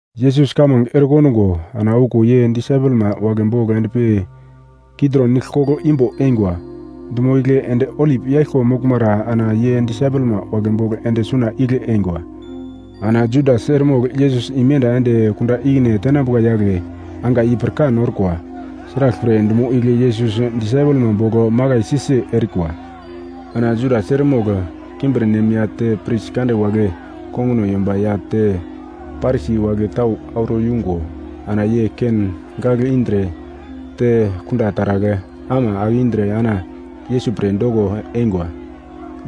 Yesus kamange erekondungo, ana okuwo ye disaipelma wagle bogl endpi Kitrong nigl koglo imbo eingwa. Dumo igle ende olip yaglko moglmara ana ye disaipelma wagle bogl ende suna igle eingwa. Ana Judas eremogl Yesus imenda ende kunda ikine tenambuka yagle angai i pirkan orkwa, sraglpre dumo igle Yesus disaipelma bogl makaisi-si erikwa. Ana Judas eremogl kimbirnem ya te pris kande wagle konguno yomba ya te Parisi wagle tau auro yungo ana ye ken gagl indre te kunda taragl ama ake indre ana Yesus pre doko eingwa.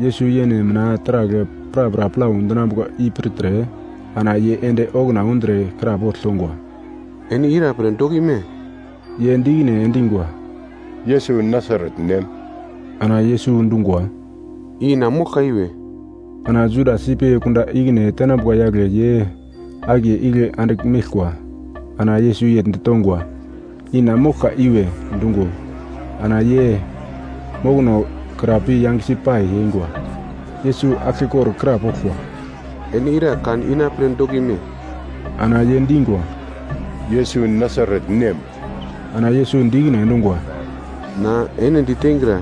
Yesus yene mina taragl prapra plau dinambuka i pirtre, ana ye ende okuna undre krapogl tongwa, “Ene ira pre dokime?” Ye di ikine endingwa, “Yesus Nasaret nem.” Ana Yesus dungwa, “I na moglka iwe.” Ana Judas ipi kunda ikine tenambuka yagle ye akiye igle andigl meglkwa. Ana Yesus yegl ditongwa, “I na moglka iwe” dungo, ana ye mokonokra pi yangesi pai eingwa. Yesus aglkekor krapoglkwa, “Ene ira kan ina pre dokime?” Ana ye dingwa, “Yesus Nasaret nem.” Ana Yesus di ikine endungwa, “Na ene diteingra,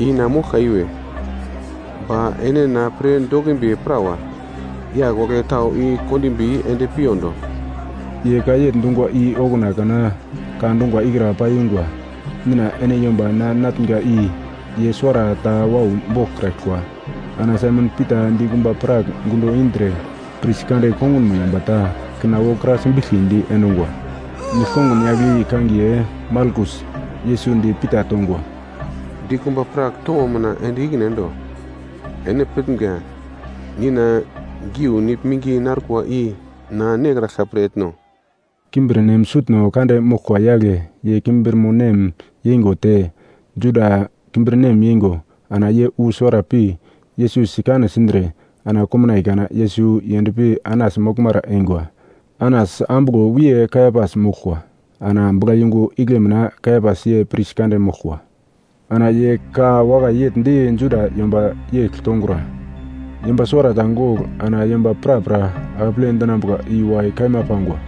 i na moglka iwe, ba ene na pre dokimbi prawa, yagl wagle tau i kondimbi ende piyondo.” Ye ka yegl dungwa i okuna kana ka dungwa ikra paiyungwa, “Nina ene yomba na natnga i ye suwarata wau boglkraglkwa.” Ana Saimon Pita dikumba prak gundo indre pris kande kongunmo yomba ta kina wokra simbiglkidi endungwa. Nigl-kongun yagl i kangiye Malkus. Yesus di Pita tongwa, “Dikumba prak towo mina ende ikine endo. Ene pitnga Nina geu nigl minge narkwa i na nekraglka pre etno?” Kimbirnem sutno kande moglkwa yagle ye kimbirmonem yeingo te Juda kimbirnem yeingo ana ye wu suwara pi Yesus sikane sindre, ana komnaiye kana Yesus yendpi Anas moglmara eingwa. Anas ambuglo wiye Kaiapas moglkwa, ana buglayungu igle mina Kaiapas ye pris kande moglkwa. Ana ye ka wakai yegl di Juda yomba yegl tongura, “Yomba suwarata gogl ana yomba prapra akeple dinambuka i wakai kaima pangwa.”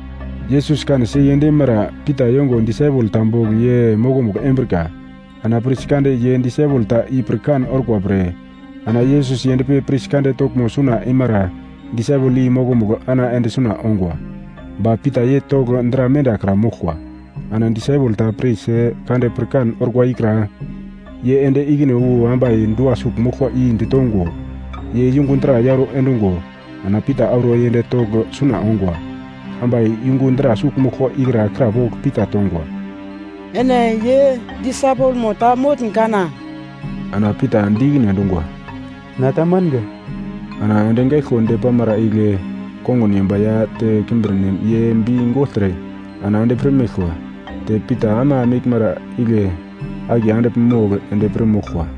Yesus kanesi yend eimara Pita yongo disaipel ta bogl ye mokomugl embrika, ana pris kande ye disaipel ta i pirkan orkwa pre, ana Yesus yendpi pris kande toglmo suna eimara disaipel i mokomugl ana ende suna ongwa. Ba Pita ye togl dra mendakra moglkwa. Ana disaipel ta pris kande pirkan orkwa ikra, ye ende ikine wu ambai dua sugl moglkwa i ditongo, ye yungu dra yauro endungo, ana Pita auro yend togl suna ongwa. Ambai yungu dra sugl moglkwa ikra krapogl Pita tongwa, “Ene ye disaipelmo ta motn kana?” Ana Pita di ikine endungwa, “Na ta manga.” Ana endi gaiglko depamara igle kongun yomba ya te kimbirnem ye bi gogltre ana endi pir meglkwa. Te Pita ama meglmara igle akiye andigl mogl endi pir moglkwa.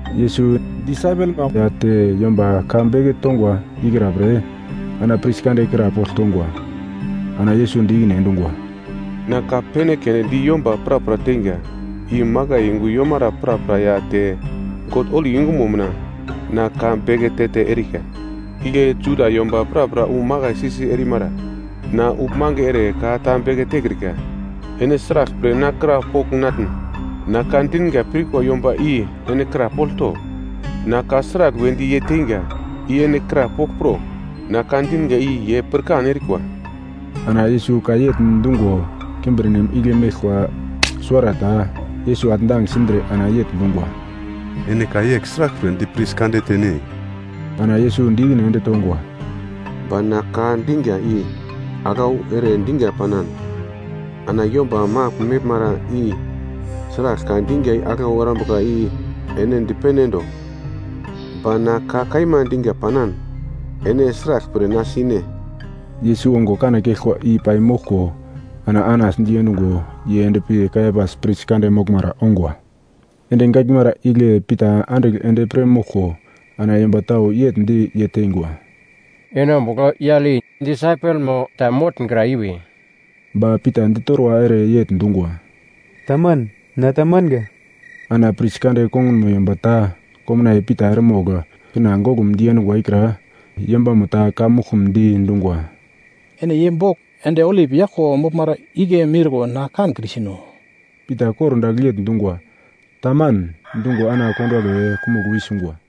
Yesus disaipelma ya te yomba ka beke tongwa ikra pre ana pris kande krapogl tongwa. Ana Yesus di ikine endungwa, “Na ka pene keunde di yomba prapra teinga, i makai yungu yomara prapra ya te God holi yungumo mina na ka beke te-te erika, igle Juda yomba prapra wu makaisi-si erimara. Na uglmange ere ka ta beke tekrika. Ene sraglpre na krapogl natn? Na ka dinga pirkwa yomba i ene krapogl to. Na ka sragl wedi ye teinga i ene krapogl pro, na ka dinga i ye pirkan erikwa.” Ana Yesus ka yegl dungo, kimbirnem igle meglkwa suwarata Yesus atndang sindre ana yegl dungwa, “Ene ka yegl sraglpre di pris kande tene?” Ana Yesus di ikine ende tongwa, “Ba na ka dinga i aglau ere dinga panan, ana yomba magl meglmara i sragl ka dinga aglau erambuka i ene dipene endo. Ba na ka kaima dinga panan, ene sraglpre na sine?” Yesus ongo kane keglkwa i paimoglko ana Anas diendungo ye ende pi Kaiapas pris kande moglmara ongwa. Endi gaglmara igle Pita andigl endi pir moglko, ana yomba tau yegl di ye teingwa, “Ene ombugl yagl i disaipelmo ta motngra iwe?” Ba Pita ditorwa ere yegl dungwa, “Taman, na ta manga.” Ana pris kande kongunmo yomba ta, komnaiye Pita eremogl kina goglum diendungwa ikra, yombamo ta ka muglkumdi dungwa, “Ene ye bogl endi olip yaglko moglmara igle miurko na kankrisino?” Pita kordagl yegl dungwa, “Taman” dungo, ana konduwagle kumugl wi sungwa.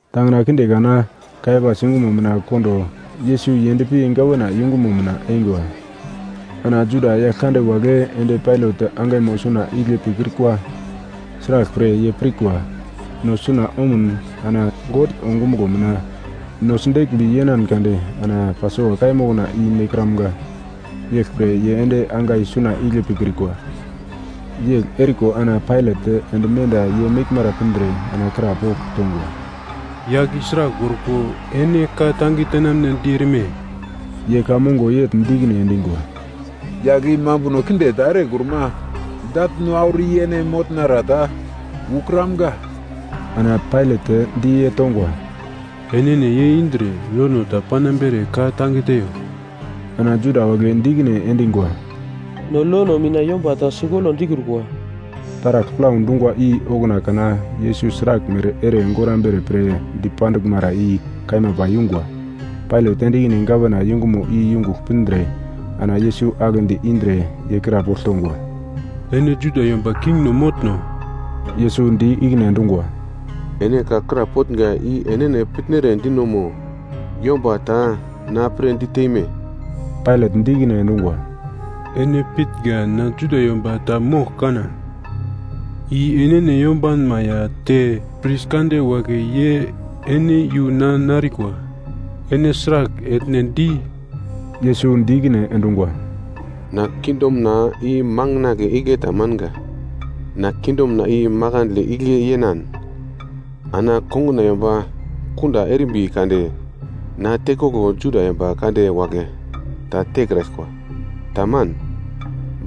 Tangina kinde kana Kaiapas yungumo mina kondo Yesus yendpi gawana yungumo mina eingwa. Ana Juda yagl kande wagle ende Pailat angaimo suna igle pikrikwa. Sraglpre ye pirkwa, no suna omun ana God ongumuglo mina no sideglmbi yenan kade ana Pasova kaiya mokna i nekramga, yeglpre ye ende angai suna igle pikrikwa. Yegl eriko ana Pailat ende menda ye meglmara pindre ana krapogl tongwa, “Yagl i sragl orko ene ka-tange tenamnedi erime?” Ye ka mongo yegl di ikine endingwa, “Yagl i mambuno kinde ta erekruma dagl no auro i ene motnara ta ukramga.” Ana Pailat di ye tongwa, “Enene ye indre lono ta panambere ka-tange teiyo.” Ana Juda wagle di ikine endingwa, “No lono mina yomba ta sigolo dikrukwa.” Taragl plau dungwa i okuna kana Yesus sraglmere ere gorambere pre dipanduglmara i kaima paiyungwa. Pailat ende ikine gavana yungumo i yungugl pindre ana Yesus aglendi indre ye krapogl tongwa, “Ene Juda yomba kingno motno?” Yesus di ikine endungwa, “Ene ka krapotnga i enene pitnere dino mo yomba ta na pre diteme?” Pailat di ikine endungwa, “Ene pitnga na Juda yomba ta mogl kana? I enene yombanma ya te pris kande wagle ye ene iyu na narikwa. Ene sragl etne di?” Yesus di ikine endungwa, “Na kingdomna i makandle igle ta manga. Na kingdomna i makandle igle yenan, ana konguna yomba kunda erimbi kade na tekoglo Juda yomba kande wagle ta tekraglkwa. Taman.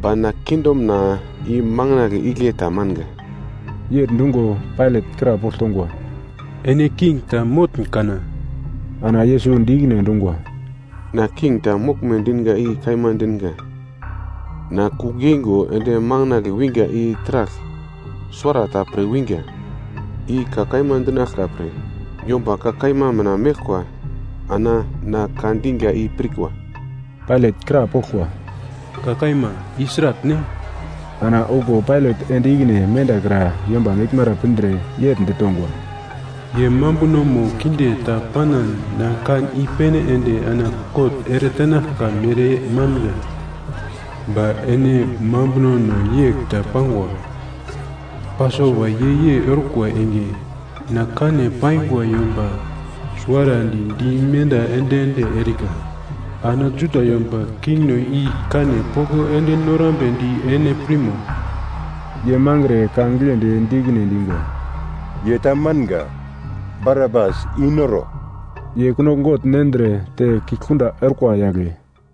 Ba na kingdomna i manginagle igle ta manga.” Yegl dungo Pailat krapogl tongwa, “Ene king ta motn kana?” Ana Yesus di ikine endungwa, “Na king ta moglme dinga i kaima dinga. Na kugl yeingo ende makandle winga i taragl suwarata pre winga. I ka kaima dinaglka pre. Yomba ka kaima mina meglkwa ana na ka dinga i pirkwa.” Pailat krapoglkwa, “Ka kaima i sratne?” Ana okuwo Pailat ende ikine mendakra yomba meglmara pindre yegl ditongwa, “Ye mambunomo kinde ta panan na kan i-pene ende ana kot eretenaglka mere manga. Ba ene mambunono yegl ta pangwa, Pasova yei-yei orkwa enge na kane paingwa yomba suwarandi dimenda ende-ende erika. Ana Juda yomba kingno i kane poko ende norambedi ene pirmo?” Ye mangre ka giglendi di ikine endingwa, “Ye ta manga! Barabas i-noro.” Ye kunogl gogl nendre te kigl kunda orkwa yagle.